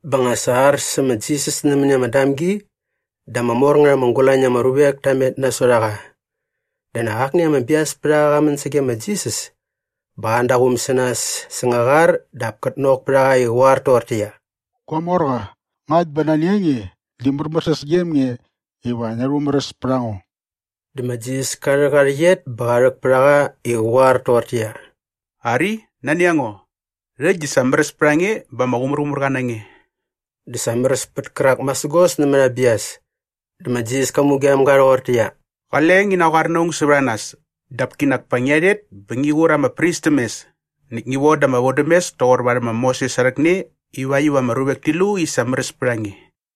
Bä nga sa ar sä ma Jisas nämäni ama damgi dä ama mor ngät ama gulañ na ama ruvek ta met nasot a qa. Dä nak akni ama biaspärhaqa qa män sage ma Jisas bä qa an da aa quum sä nas säng aa qar dap kät nok pät a qa i qä qoar toqortäqyia, “Gua morqa, ngakt bä nani a nge di märmärsäs gem nge iva ngia rhumäräs pät a ngo.” Dä ma Jisas ka rhäk aa rhäqyet bä qa rhäk pät a qa i qä qoar toqortäqyia, “Ari, nani a ngo, rhäkt di sa märäs pät a nge bä ama qumärqumärqa na nge.” Dä sa märäs pät kärak masägos nämät aa bias. Dä ma Jisas ka mugem ga rhoqortäqyia, “Qale ngi naqoar na aung sävät a nas dap kinak pa ngia rhet bä ngi qur ama pris täm mes näkt ngi voda ama vodämes toqor varhäm ma Moses aa rhäkne ivakt iva ama ruvek ti lu i sa märäs pät a nge.”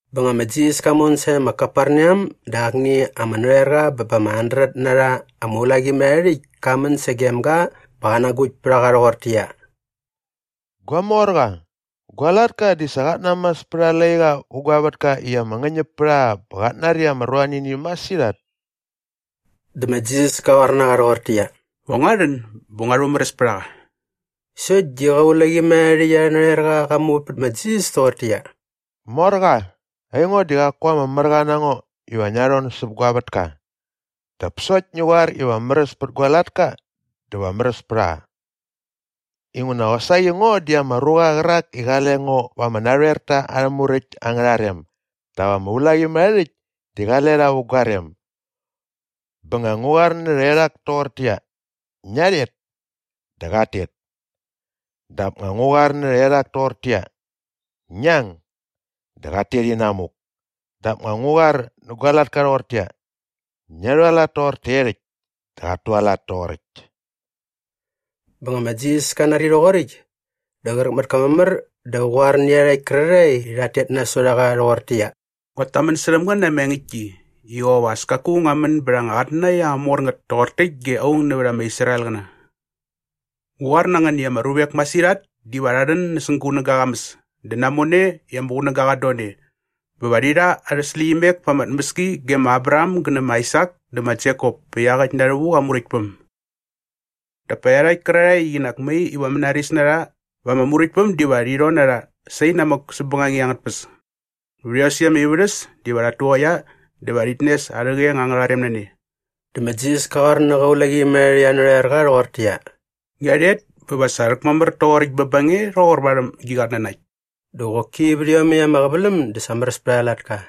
Bä nga ma Jisas ka mon sae ma Kaperneam dä akni ama narhoerqa bä ba ama handret na rha ama ulaqimärharhärhäkt ka män sagem ga bä qa nagukt pät a qa rhoqortäqyia, “Gua morqa, gua latka di sa qat namas pät aa laiqa vä gua vätka i ama ngäñäp pät a qa bä qat nari ama ruanini masirhat.” Dä ma Jisas ka qoar na qa rhoqortäqyia, “Va ngua rhän bä ngua rhumäräs pät a qa.” Sokt di qä ulaqimärharhärhäkt arhä narhoerqa qa muvät pät ma Jisas toqortäqyia, “Morqa, aingo di qaku ama märqa na ngo iva ngia rhon säp gua vätka. Dap sokt ngi qoar iva märäs pät gua latka dä va märäs pät a qa. Inguna qosaqi ngo di ama ruqa qärak i qale ngo va ama narhoerta arhä muräkt angärha rem dap ama ulaqimärharhärhäkt di qale rha vä gua rem. Bä nga ngu qoar nä rhaerhak toqortäqyia, ‘Ngia rhet’ dä qat tet. Dap nga ngu qoar nä rhaerhak toqortäqyia, ‘Ngi ang’ dä qat tet inamuk. Dap nga ngu qoar nä gua latka rhoqortäqyia, ‘Ngia rhualat toqor taerhäkt’ dä qat tualat toqoräkt.” Bä nga ma Jisas ka nari rhoqoräkt dä qräk mät ka mamär dä qa qoar nä iarhakt kärarhae i rhat tet nasot a qa rhoqortäqyia, “Nguat tamän särhäm ngän na ama engäktki i qop as kaku ngua män bät anga qatnanakt ama mor ngät toqor täkt ge aung nävät ama Israelqäna. Ngu qoar na ngän i ama ruvek masirhat diva rha rhän näsäng gunäga aa qamäs dä namone i ama qunäga qat don e bä va rhi rha arhä släqyimek pa ama tmäski ge ma Abraham gä nä ma Aisak dä ma Jekop pä iaqäkt na rhävuk aa Muräktpäm. Dap pa iarhakt kärarhae i qinak mai iva mänaris na rha vä ama Muräktpäm diva rhi rhon na rha sainamäk säp bängangit angät tpäs. Vät iosäkt ama ivärhäs diva rhat tuqaia dä va rhit nes arhä qeng angärha rem na ne.” Dä ma Jisas ka qoar nä qä ulaqimärharhärhäkt arhä narhoerqa rhoqortäqyia, “Ngia rhet bä sa va rhäkmamär toqoräkt bä ba nge rhoqor varhäm gi qatnanakt.” Dä qoki vät iomäkt ama qäväläm dä sa märäs pät aa latka.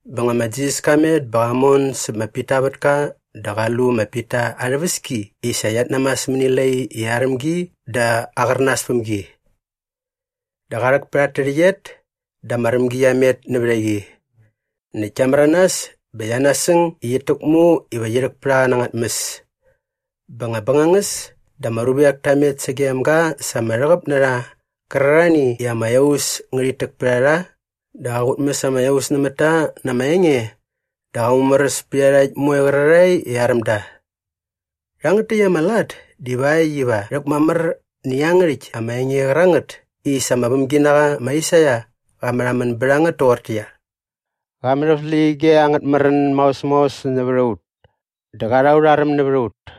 Bä nga ma Jisas ka met bä qa mon säp ma Pita aa vätka dä qa lu ma Pita aa rhäväski i sa qiat namas mäni lai i aräm gi dä aqärnas päm gi. Dä qa rhäk pät at tärhäqyet dä ama rämgi qia met nävät a qi. Näkt kia märanas bä qia nasäng i qit täkmu iva qi rhäk pät a qa na anga tmäs. Bä nga bängangäs dä ama ruvek ta met sagem ga sa ama rhäqäp na rha qärarhani i ama iaus ngärhit täk pät a rha dä qa qutmäs ama iaus nämät ta na ama enge dä qa mumäräs pät iarhakt moe qärarhae i aräm da. Rhangät täkt ama lat divakt iva rhäkmamär nä iangärhäkt ama enge qärangät i sa ama vämginaqa ma Aisaia qa märhamän bät a ngät toqortäqyia, “Qa mät aut släqyige angät märän maos maos nävät a ut dä qa rha aurha räm nävät a ut.”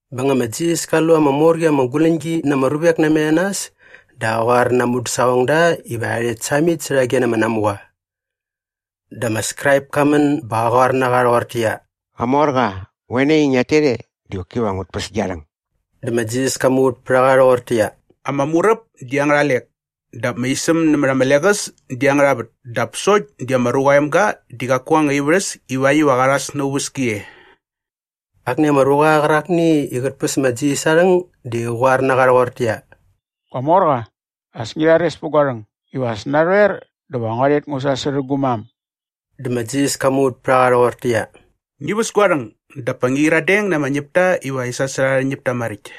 Bä nga ma Jisas ka lu ama mor qi ama guläñgi na ama ruvek namet a nas dä qa qoar na aa mudäsaqongda iva rha rhet samit särhage na ama namuqa. Dä ama Skraip ka män bä qa qoar na qa rhoqortäqyia, “Qamorqa, qoe nai i ngiat tet e di qoki va ngut päs gia rhäng.” Dä ma Jisas ka muvät pät a qa rhoqortäqyia, “Ama muräp di angärha lek dap ama isäm nämät ama leqäs di angärha vät dap sokt di ma Ruqa aa Emga di qaku aa anga ivärhäs ivakt iva qa rhas na aa uväski e.” Akni ama ruqa qärakni i qät päs ma Jisas aa rhäng di qa qoar na qa rhoqortäqyia, “Gua morqa, as ngi rhares pät gua rhäng iva as narhoer dä va ngua rhet ngu sasärhä gu mam.” Dä ma Jisas ka muvät pät a qa rhoqortäqyia, “Ngi väs gua rhäng dap ngi qyiradeng na ama ñäpta iva rhi sasärha arhä ñäpta maräkt.”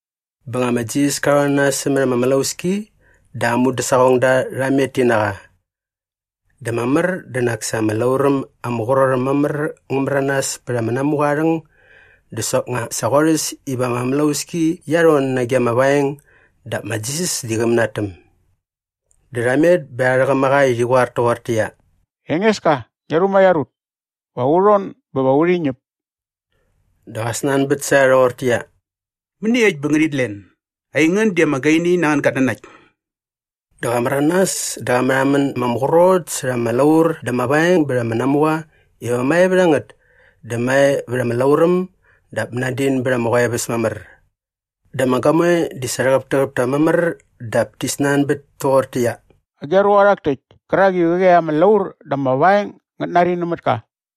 Bä nga ma Jisas ka rhon na nas sämät ama mlauski dä aa mudäsaqongda rha met ti na qa. Dä mamär di nak sa ama lauräm ama qrot äm mamär ngä märanas pät ama namuqa aa rhäng dä soknga sa qorhäs iva ama mlauski qia rhon nage ama vaeng dap ma Jisas di qä mänatäm. Dä rha met bä rha rhäqäm a qa i rhi qoar toqortäqyia, “Engeska, ngia rhumaiar ut! Va u rhon bä va urhi ñäp!” Dä qa snanbät sä rha rhoqortäqyia, “Mäniekt bä ngänit len? Aingän di ama gaini nä angän gatnanakt!” Dä qa märanas dä qa märhamän ma ama qrot särha ama laur dä ama vaeng bät ama namuqa iva mae vät a ngät dä mae vät ama lauräm dap mänadin bät ama qoeväs mamär. Dä ama gamoe di sa rhäqäptäqäp ta mamär dap ti snanbät toqortäqyia, “Agi a ruqa rhak täkt kärak i qäqi ama laur dä ama vaeng ngät nari nämät ka?”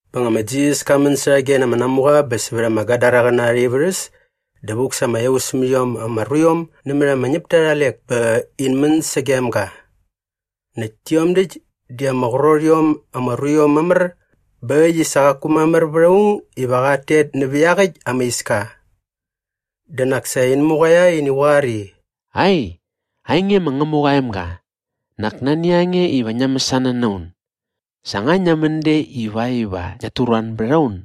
Bä nga ma Jisas ka män särhage na ama namuqa bä sävät ama Gadaraqäna arha ivärhäs dä vuk sa ama iaus mät iom ama ruiom nämät ama ñäpta arha lek bä in män sagem ga. Näkt tiom däkt di ama qrot iom ama ruiom mamär bä äkt i sa qaku mamär vät aung iva qat tet nävä iaqyäkt ama iska. Dä nak sa in muqaia i in goar i, “Ai, ainge ma Ngämuqa aa emga, nak nani a nge iva ngia mäsana na un? Sa nga ngia män de ivakt iva ngiat turuan bät a un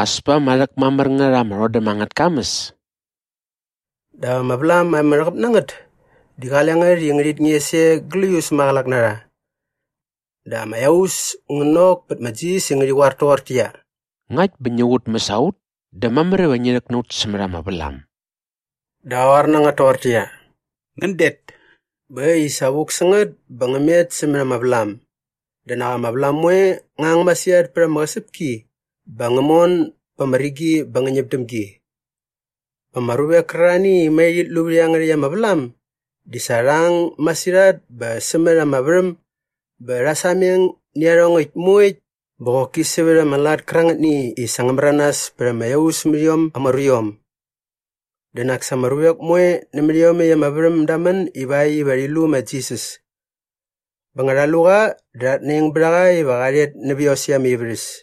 as pa ama rhäkmamär ngät ama rhodäm angät kamäs?” Dap ama vlam ama rhäqäp na ngät di qale ngät i ngärhit nges e gläius maqälak na rha. Dä ama iaus ngä nok pät ma Jisas i ngärhi qoar toqortäqyia, “Ngakt bä ngi kutmäs a ut dä mamär iva ngi rhäk na ut sämät ama vlam.” Dä qa qoar na ngät toqortäqyia, “Ngän det.” Bä äkt i sa vuk sä ngät bä ngä met sämät ama vlam. Dä nak ama vlam moe ngä ang masirhat pät ama qäsäpki bä ngä mon ba ama rigi bä ngä ñäp däm gi. Bä ama ruvek kärarhani i mai rhit lu vät iangärhäkt ama vlam di sa rha ang masirhat bä sämät ama värhäm bä rha sameng nä iarhongäkt moekt bä qoki sävät ama lat kärangätni i sa ngä märanas pät ama iaus mät iom ama ruiom. Dä nak sa ama ruvek moe nämät iomäkt ama värhäm da män ivakt iva rhi lu ma Jisas. Bä nga rha lu qa dä rhat naing bät a qa iva qa rhet nävä iosäkt arha ivärhäs.